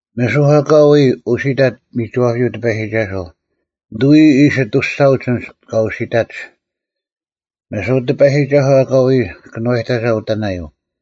ᒥᓱᐧᒄ ᐊᑲ ᐎᔾ ᐅᓯᑕᑦ ᒥᒋᐛᔪᐤ ᑎᐸᔨᒋᒐᓱᐤ, ᓂᑐᐎ ᐃᓯ ᐊᑐᔅᒐᐅᒡ ᐊᓐᒡ ᑲ ᐅᓯᑕᒡ: ᒥᓱᐧᒄ ᑎᐸᔨᒋᒐᓱᐤ ᐊᑲ ᐎᔾ ᑲᓄᐛᔨᑕᒐ ᐅᑕᓇᔪᐤ,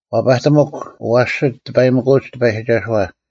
ᐛᐸᑎᒧᒃ ᐊᐛᓯᒡ ᑎᐸᔨᒥᑯᐅᒡ ᑎᐸᔨᒋᒐᓱᐛ;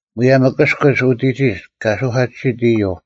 ᒧᔭᒻ ᐊᑭᔅᑯᒡ ᐅᑎᒋᒡ ᑲ ᓱᐧᑲᑎᓯᑦ ᐃᔪᐤ;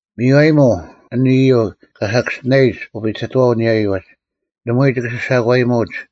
ᒥᔽᔨᒧᐤ ᐊᓇ ᐃᔪᐤ ᑲ ᓴᑭᔅᒋᓇᔨᒡ ᐅᐱᑕᑥᓐ ᐊᓂᔭᔪᐤ ᐅᒡ: ᓇᒪᐎᔾ ᒋᑭ ᓯᓴᒂᔨᒧᐅᒡ,